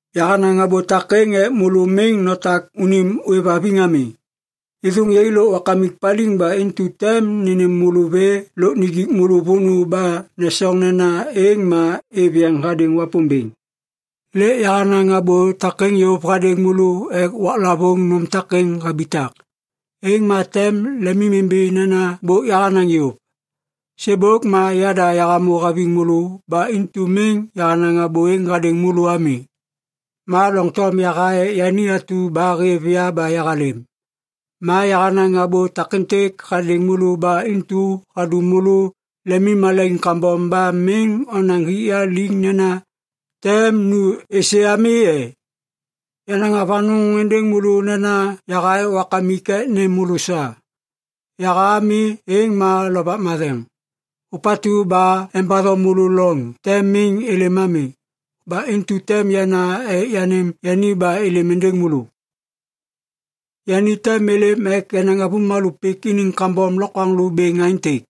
“Yahanaŋ abô takêŋ ek môlô miŋ notak unim ôêvhaviŋ ami. Êthôŋ yai lôk Wakamik paliŋ ba intu tem nênêm môlô vê lôk nijik môlô vônô ba nesoŋ nena êŋ ma êv yeŋ hadêŋ Wapômbêŋ. Lêk yahanaŋ abô takêŋ yôv hadêŋ môlô ek waklavôŋ nôm takêŋ habitak, êŋ ma tem lemimimbi nena bôk yahanaŋ yôv. Sêbôk ma yada yahamô haviŋ môlô ba intu miŋ yahanaŋ abô êŋ hadêŋ môlô ami. “Ma doŋtom yaha ek yani atu ba hêv ya ba yahalêm. Ma yahanaŋ abô takêntêk hadêŋ môlô ba intu hadum môlô lemimmalaiŋ kambom ba miŋ onaŋ hik ya liŋ nena ‘tem nu êsê’ ami e? Yanaŋ avanôŋ êndêŋ môlô nena yaha ek Wakamik ek nêm môlô sa. Yaha ami êŋ ma Lovak Matheŋ, ôpatu ba embatho môlô loŋ tem miŋ êlêm ami. Ba intu tem yana ek yanêm yani ba êlêm êndêŋ môlô. Yani tem êlêm ek enaŋ avômalô pik iniŋ kambom lokwaŋlô bêŋ aêntêk: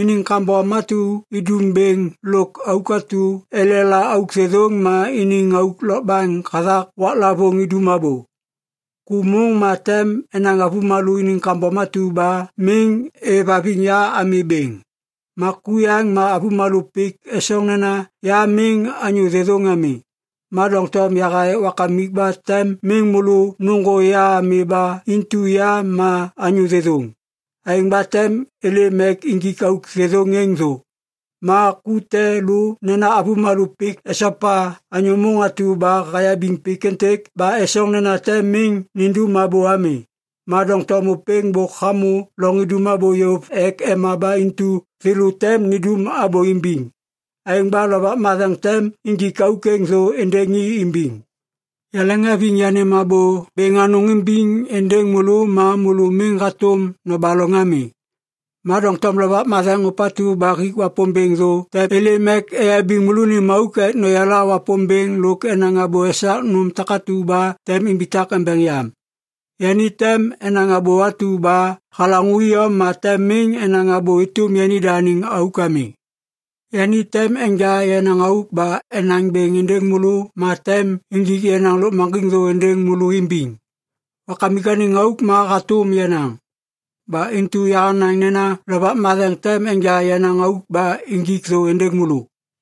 iniŋ kambom atu idum bêŋ lôk auk atu elela auk thêthôŋ ma iniŋ auk lôkbaŋ hathak waklavôŋ idum abô. Ku môŋ ma tem enaŋ avômalô iniŋ kambom atu ba miŋ êvhaviŋ ya ami bêŋ. Ma ku yaŋ ma avômalô pik esoŋ nena ya miŋ anyô thêthôŋ ami. Ma doŋtom yaha ek Wakamik ba tem miŋ môlô nôŋgô ya ami ba intu ya ma anyô thêthôŋ. Aêŋ ba tem êlêm ek injik auk thêthôŋ êŋ thô. Ma ku te lô nena avômalô pik esopa anyô môŋ atu ba hayabiŋ pik êntêk ba esoŋ nena tem miŋ nindum abô ami. Ma doŋtom ôpêŋ bôk hamô loŋ idum abô yôv ek ema ba intu thêlô tem nindum abô imbiŋ. Aêŋ ba Lovak Matheŋ tem injik auk êŋ thô êndêŋ i imbiŋ. “Yaleŋhaviŋ yanêm abô bêŋ anôŋ imbiŋ êndêŋ môlô ma môlô miŋ hatôm nobaloŋ ami. Ma doŋtom Lovak Matheŋ ôpatu ba hik Wapômbêŋ thô tem êlêm ek eyabiŋ môlônim auk ek noyala Wapômbêŋ lôk enaŋ abô esak nôm takatu ba tem imbitak embeŋ yam. Yani tem enaŋ abô atu ba halaŋô iyom ma tem miŋ enaŋ abô êtôm yanida anêŋ auk ami. Yani tem enja yenaŋ auk ba enaŋ bêŋ êndêŋ môlô ma tem injik yenaŋ lôkmaŋgiŋ thô êndêŋ môlô imbiŋ. Wakamik anêŋ auk ma hatôm yenaŋ. Ba intu yahanaŋ nena Lovak Matheŋ tem enja yenaŋ auk ba injik thô êndêŋ môlô.”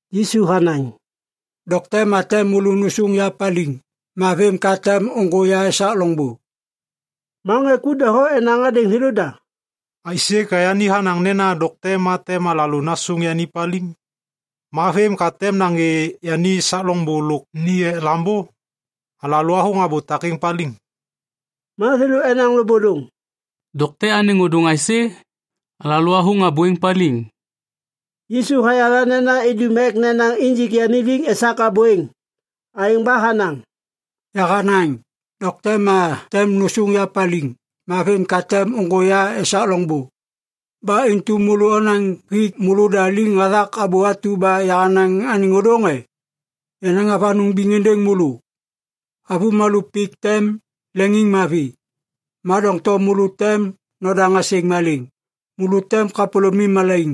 Yisu hanaŋ, “Dokte ma tem môlô nôsôŋ ya paliŋ. Ma vêm ka tem ôŋgô ya esak loŋbô.” Ma ŋê ku doho enaŋ hadêŋ thêlôda, “Aisê ka yani hanaŋ nena dokte ma tem alalô nasôŋ yani paliŋ? Ma vêm ka tem nagê yani esak loŋbô lôk ni ek Lambô? Alalô athôŋ abô takêŋ paliŋ.” Ma thêlô enaŋ lôbôlôŋ, “‘Dokte’ anêŋ ôdôŋ aisê? Alalô athôŋ abô êŋ paliŋ.” Yisu hayala nena idum ek nenaŋ injik yani liŋ esak abô êŋ. Aêŋ ba hanaŋ, “Yahanaŋ ‘Dokte ma tem nôsôŋ ya paliŋ. Ma vêm ka tem ôŋgô ya esak loŋbô.’ Ba intu môlô onaŋ hik môlôda liŋ hathak abô atu ba yahanaŋ anêŋ ôdôŋ e? Yanaŋ avanôŋ biŋ êndêŋ môlô. Avômalô pik tem leŋiŋmavi. Ma doŋtom môlô tem nodaŋ asêŋ malêŋ. Môlô tem kapôlômim malaiŋ.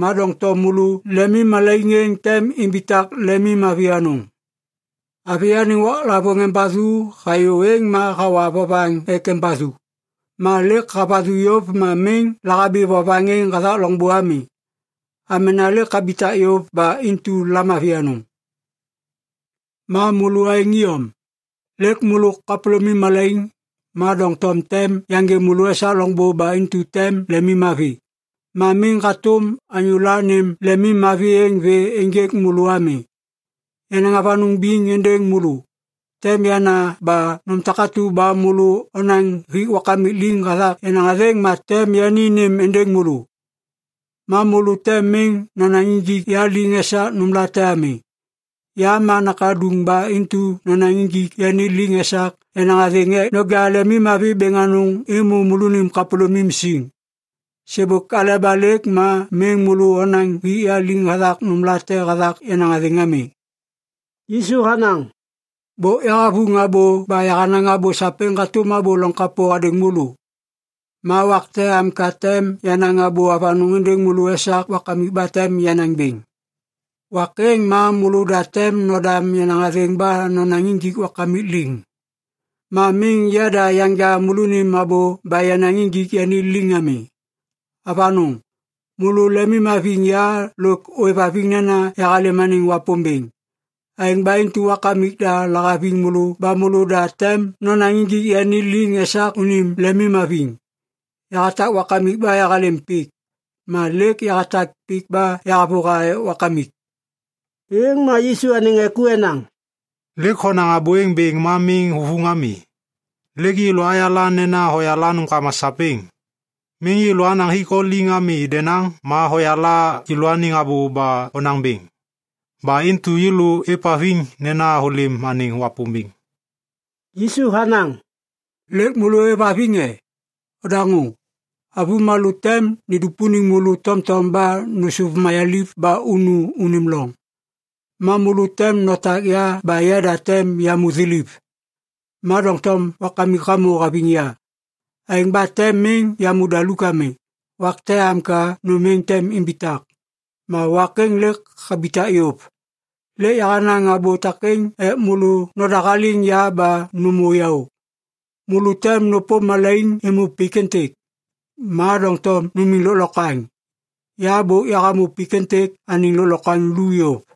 Ma doŋtom môlô lemimmalaiŋ êŋ tem imbitak lemimmavi anôŋ. Avi anêŋ waklavôŋ embathu hayô êŋ ma hawa vovaŋ ek embathu. Ma lêk havathu yôv ma miŋ lahabi vovaŋ êŋ hathak loŋbô ami. Amena lêk habitak yôv ba intu lamavi anôŋ. Ma môlô aêŋ iyom. Lêk môlô kapôlômim malaiŋ. Ma doŋtom tem yaŋgê môlô esak loŋbô ba intu tem lemim mavi. Ma miŋ hatôm anyô la nêm lemim mavi êŋ vê ênjêk môlô ami. Yanaŋ avanôŋ biŋ êndêŋ môlô. Tem yana ba nôm takatu ba môlô onaŋ hik Wakamik liŋ hathak yenaŋ athêŋ ma tem yani nêm êndêŋ môlô. Ma môlô tem miŋ nonaŋ injik ya liŋ esak nômlate ami. Ya ma Nakaduŋ ba intu nonaŋ injik yani liŋ esak yenaŋ athêŋ ek noja lemimmavi bêŋ anôŋ êmô môlô kapôlômim siŋ. Sêbôk aleba lêk ma miŋ môlô onaŋ hik yani liŋ hathak nômlate hathak yenaŋ athêŋ ami.” Yisu hanaŋ, “Bôk yahavuŋ abô ba yahanaŋ abô sapêŋ hatôm abô loŋ kapô hadêŋ môlô. Ma wak te am ka tem yanaŋ abô avanôŋ êndêŋ môlô esak Wakamik ba tem yanaŋ bêŋ. Wak êŋ ma môlôda tem nodam yenaŋ athêŋ ba nonaŋ injik Wakamik liŋ. Ma miŋ yada yanja môlônim abô ba yanaŋ injik yani liŋ ami. Avanôŋ! Môlô lemimhaviŋ ya lôk ôêvhaviŋ nena yahalêm anêŋ Wapômbêŋ. Aêŋ ba intu Wakamik da lahaviŋ môlô ba môlôda tem nonaŋ injik yani liŋ esak unim lemimhaviŋ. Yahatak Wakamik ba yahalêm pik. Ma lêk yahatak pik ba yahavôha ek Wakamik.” Êŋ ma Yisu anêŋ ŋê ku enaŋ, “Lêk honaŋ abô êŋ bêŋ ma miŋ huvuŋ ami. Lêk yêlô ayala nena hoyala nômkama sapêŋ. Miŋ yêlô anaŋ hik o liŋ ami denaŋ ma hoyala yêlôaniŋ abô ba honaŋ bêŋ. Ba intu yêlô êvhaviŋ nena hôlêm anêŋ Wapômbêŋ.” Yisu hanaŋ, “Lêk môlô ôêvhaviŋ e? Odaŋô! Avômalô tem nidupuniŋ môlô tomtom ba nôsôv mayaliv ba unu unim loŋ. Ma môlô tem notak ya ba yada tem yamô thiliv. Ma doŋtom Wakamik hamô haviŋ ya. Aêŋ ba tem miŋ yamô daluk ami. Wak te am ka nôm êŋ tem imbitak. Ma wak êŋ lêk habitak yôv. “Lêk yahanaŋ abô takêŋ ek môlô nodahaliŋ ya ba nômô yaô. Môlô tem nôpôm malaiŋ êmô pik êntêk. Ma doŋtom numiŋ lôklokwaŋ! Ya bôk yahamô pik êntêk anêŋ lôklokwaŋ lu yôv.”